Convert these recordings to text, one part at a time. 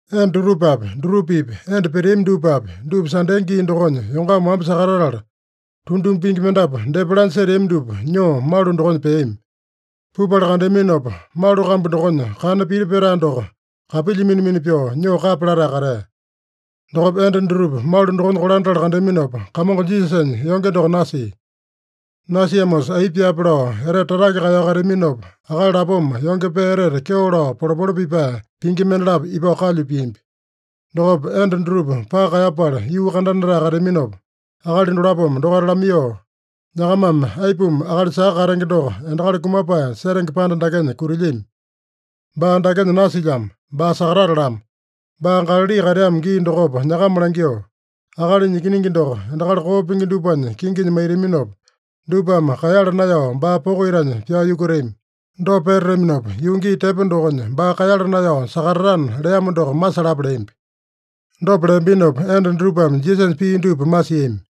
Enda dutupapi, dutupa-pipa enda peteami dupapi, dupa Sande gii dokonya yongama wamba sakatatala, tunduma pingi mendapu depa lanya seteami dupa nyoo malu dokonya peami. Pupala kandeaminopa, malu kambu dokonya kana piti petae doko kapilya mina-mina pyoo nyoo kapya latae katea. Dokopa enda dutupa malu dokonya kolandatala kandeaminopa, Kamongo Jisasanya yonge doko nasia. Nasiamosa aipa pyaape lao etete tatake kaeyao kateaminopa, akali lapoma yonge pee etete kyeo lao polepole pipae pingi mendalapo ipao kalyu piambi. Dokopa enda dutupa paka kaeyapala yuu kandanatae kateaminopa, akali dolapome dokaita lamaiyoo, “Nyakamame aipuma akali saka katenge doko endakali kumapae setenge panda dakenya kutilyami? Baa dakenya nasilyamo. Baa sakatatalamo. Baa Galali kateamo gii dokopa nyakama langyoo, ‘Akalinya Ikiningi doko endakali koo pingi dupanya kinginya maitaminopa, dupame kaeyala naeyao baa poko itanya pyao yukutami. Dopa petataminopa, yuu gii tepo dokonya baa kaeyala naeyao sakatatana’ leamo doko masalapa” leambi. Dopa leambinopa enda dutupame Jisasanya pii dupa masiami.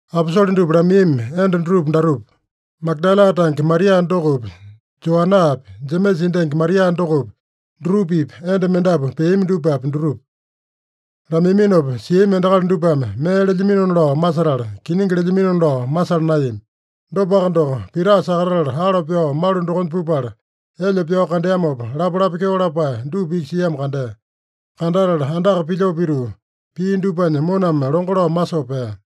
Aposole dupa lamaiyami enda dutupa datupa: Magadala tange Maria dokopi, Joanaapi, Jemesa endangi Maria dokopi, dutupa-pipa enda mendapu peami dupapi, dutupa. Lamaiyaminopa siami endakali dupame mee lelyaminona lao masetala, kiningi lelyaminona lao masala naeyami. Dopaka doko, Pita sakatatala alo pyao malu dokonya pupala, elyo pyao kandeamopa, lapalapa kyeo lapae dupa iki siamo kandea. Kandatala andaka pilyoo pituu, pia dupanya moname longo lao masoo pea.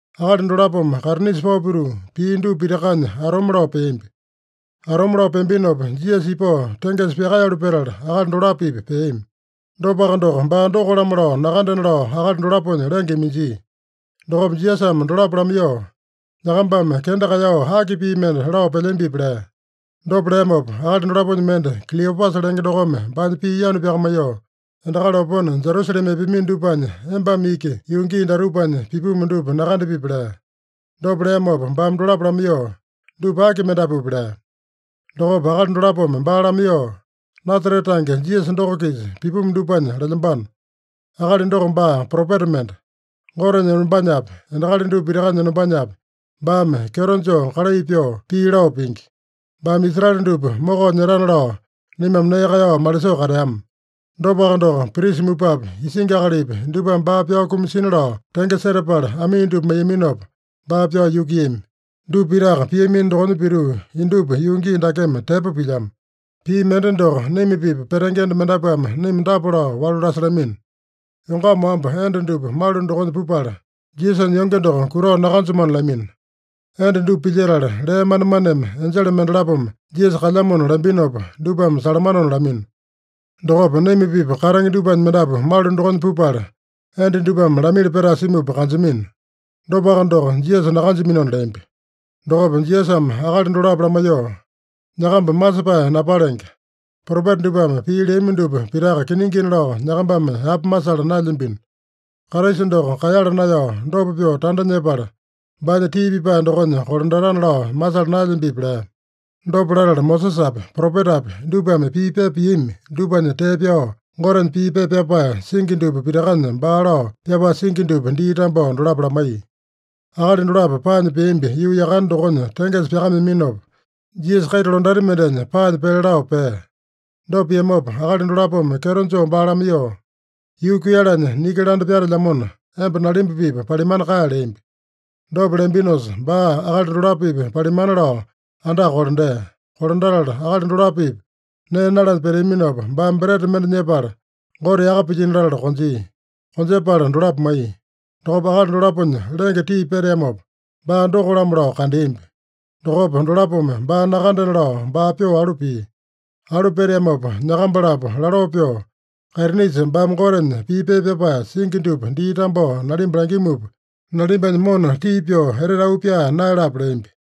Akali dolapome kaitinisa pao pituu, pia dupa pitakanya atome lao peambi. Atome lao peambinopa, Jisasa ipao tengesa pyakaeyalu petala, akali dolapo-pipa peami. Dopaka doko, baa doko-lamo lao nakandena lao akali dolaponya lenge iminjia. Dokopa Jisasame dolapo lamaiyoo, “Nyakambame kenda kaeyao aki pii mende lao pelyambipi?” lea. Dopa leamopa, akali dolaponya mende, Kiliopasa lenge dokome baanya pii yanu pyakamaiyoo, “Endakali opone Jerusalema epeamino dupanya embame iki yuu gii datupanya pipumu dupa nakandapipi?” lea. Dopa leamopa baame dolapo lamaiyoo, “Dupa aki mendapupi?” lea. Dokopa akali dolapome baa lamaiyoo, “Nasarete tange Jisasa doko-kisa pipumu dupanya lelyambano. Akali doko baa propeta mende. Gotenya enombanyapi, endakali dupa pitakanya enombanyapi, baame kyeto joo kalai pyoo, pii lao pingi. Baame Israele dupa mokao nyetana lao naimame nee kaeyao malisoo kateama. Dopaka doko, prisa mupapi, isingi akalipi dupame baa pyao kumasina lao tenge setapala amii dupa maiyaminopa, baa pyao yukuiyami. Dupa pitaka piamino dokonya pituu, indupa yuu gii dakeme tepo pilyamo. Pii mende doko, naima-pipa petenge enda mendapuame naima dapa lao walu lasalamino: Yongama wamba enda dupa malu dokonya pupala, Jisasanya yonge doko kutao nakanjamano lamino. Enda dupa pilyetala, lee manemaneme enjele mendalapome Jisasa kalyamona lambinopa, dupame salamanona lamino. Dokopa naima-pipa katenge dupanya mendapu malu dokonya pupala, enda dupame lamili petae simupa kanjamino. Dopaka doko Jisasa nakanjaminona” leambi. Dokopa Jisasame akali dolapo lamaiyoo, “Nyakamba masepae napalenge! Propeta dupame pii leami dupa pitaka kiningina lao nyakambame yapa masala naelyambino. Kraisa doko kaeyala naeyao dopa pyoo tanda nyepala, baanya tii pipae dokonya kolandatana lao masala naelyambipi?” lea. Dopa latala, Mosesapi, propetapi dupame pii pepa piami dupanya tee pyao, Gotenya pii pepa pyapae singi dupa pitakanya baa lao pyapae singi dupa dii tambao dolapo lamaiya. Akali dolapo paanya peambi yuu yakane dokonya tengesa pyakameaminopa, Jisasa kaita londati mendenya paanya pele lao pea. Dopa piamopa, akali dolapome kyeto joo baa lamaiyoo, “Yuu kuiyalanya niki landa pyatelyamona, emba nalimba-pipa palimana kae” leambi. Dopa leambinosa, baa akali dolapo-pipa palimana lao andaka kolandea. Kolandatala akali dolapo-pipa nee nalanya peteaminopa, baame breta mende nyepala, Gote yaka pilyino latala konjia. Konjepala dolapo maiya. Dokopa akali dolaponya lenge tii peteamopa, baa doko-lamo lao kandeambi. Dokopa dolapome baa nakandena lao baa pyoo alu pia. Alu peteamopa nyakamba-lapo laloo pyoo, “Kaitinisa baame Gotenya pii pepa pyapae singi dupa dii tambao nalimba langimupa, nalimbanya mona tii pyoo etete auu pyaa naeyalape” leambi.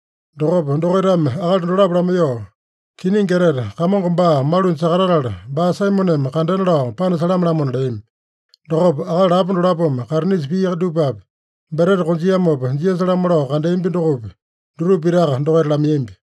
Dokopa dokaitame akali dolapo lamaiyoo, “Kiningi etete, Kamongo baa malunya sakatatala, baa Saimoneme kandena lao panasalame-lamona” leami. Dokopa akali lapo dolapome kaitinisa pia dupapi, breta konjiamopa Jisasa-lamo lao kandeambi dokopi, dutupa pitaka dokaita lamaiyambi.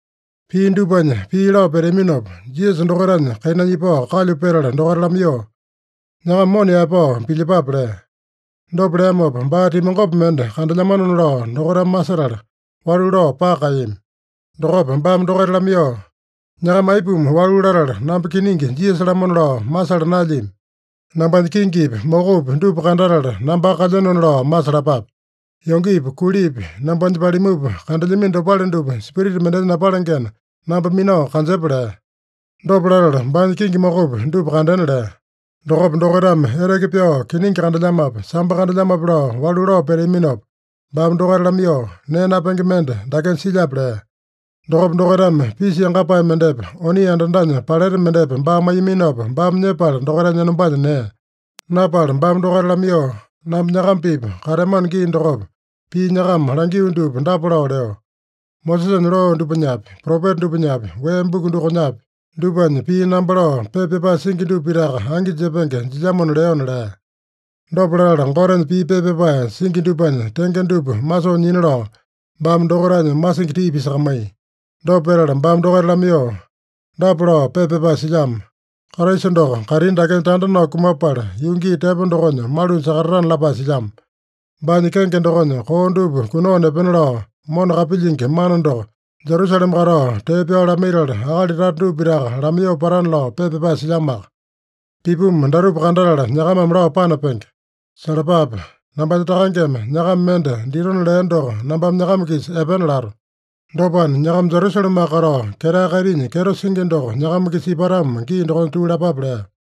Pia dupanya pii lao peteaminopa, Jisasa dokaitanya kainanya ipao kalyu petala dokaita lamaiyoo, “Nyakama mona yaepao pilyepape” lea. Dopa leamopa, baa timangopi mende kandelyamanona lao dokaitame masetala, walu lao paka kaeyami. Dokopa baame dokaita lamaiyoo, “Nyakama aipuma walu latala, namba kiningi Jisasa-lamona lao masala naelyami? Nambanya kingipi, mokopi dupa kandatala, nambaka kalyenona lao masalapape. Yongepi, kulipi nambanya palimupa kandelyamino dopale dupa spirita mendenya napalengena, namba minao kanjepa” lea. Dopa latala baanya kingi mokopi dupa kandena lea. Dokopa dokaitame eteke pyao, kiningi kandelyamape, sambo kandelyamape lao walu lao peteaminopa, baame dokaita lamaiyoo, “Nee napenge mende dakenya silyape?” lea. Dokopa dokaitame pisa yangapae mendepa, oni andandanya paleta mendepa baa maiyaminopa, baame nyepala dokaitanya enombanya nea. Napala baame dokaita lamaiyoo, “Namba nyakama-pipa kateamano gii dokopa, pii nyakama langio dupa dapa lao leo: Mosesanya loo dupanyapi, Propeta dupanyapi, Wee Buku dokonyapi, dupanya pii namba lao pepa pyapae singi dupa pitaka angi jepenge jilyamona leona” lea. Dopa latala, Gotenya pii pepa pyapae singi dupanya tenge dupa masoo nyina lao, baame dokaitanya masingi tii pisakamaiya. Dopa petala baame dokaita lamaiyoo, “Dapa lao pepa pyapae silyamo: Kraisa doko kaitini dakenya tanda nao kumapala, yuu gii tepo dokonya malunya sakatatana lapae silyamo. Baanya kenge dokonya koo dupa kunao nepena lao mona kapilyingi mana doko, Jerusalema katao tee pyao lamaitala, akali tata dupa pitaka lamaiyoo patana lao pepa pyapae silyamoaka. Pipumu datupa kandatala, nyakamame lao panapenge. Salapape! Nambanya Takangeme nyakama mende ditona lea doko nambame nyakama-kisa epena lato. Dopana, nyakama Jerusalemaka katao, ketae kaitinya kyeto singi doko nyakama-kisa ipatamo gii dokonya tuu lapape” lea.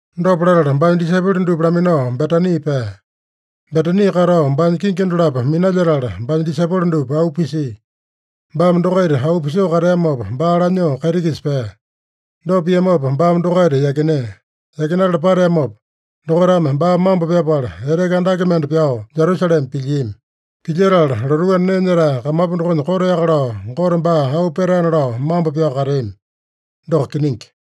Dopa latala, baanya disaipolo dupa laminao Betani pea. Betani katao baanya kingi dolapo minalyetala, baame disaipolo dupa auu pisia. Baame dokaita auu pisoo kateamopa, baa lanyoo kaiti-kisa pea. Dopa piamopa baame dokaita yakinea. Yakinatala pateamopa, dokaitame baa mambo pyapala, eteke andake mende pyao Jerusalema pilyiami. Pilyetala lotuu anda nee nyetae kamapu dokonya koteaka lao Gote baa auu petaena lao mambo pyao kateami. Doko kiningi.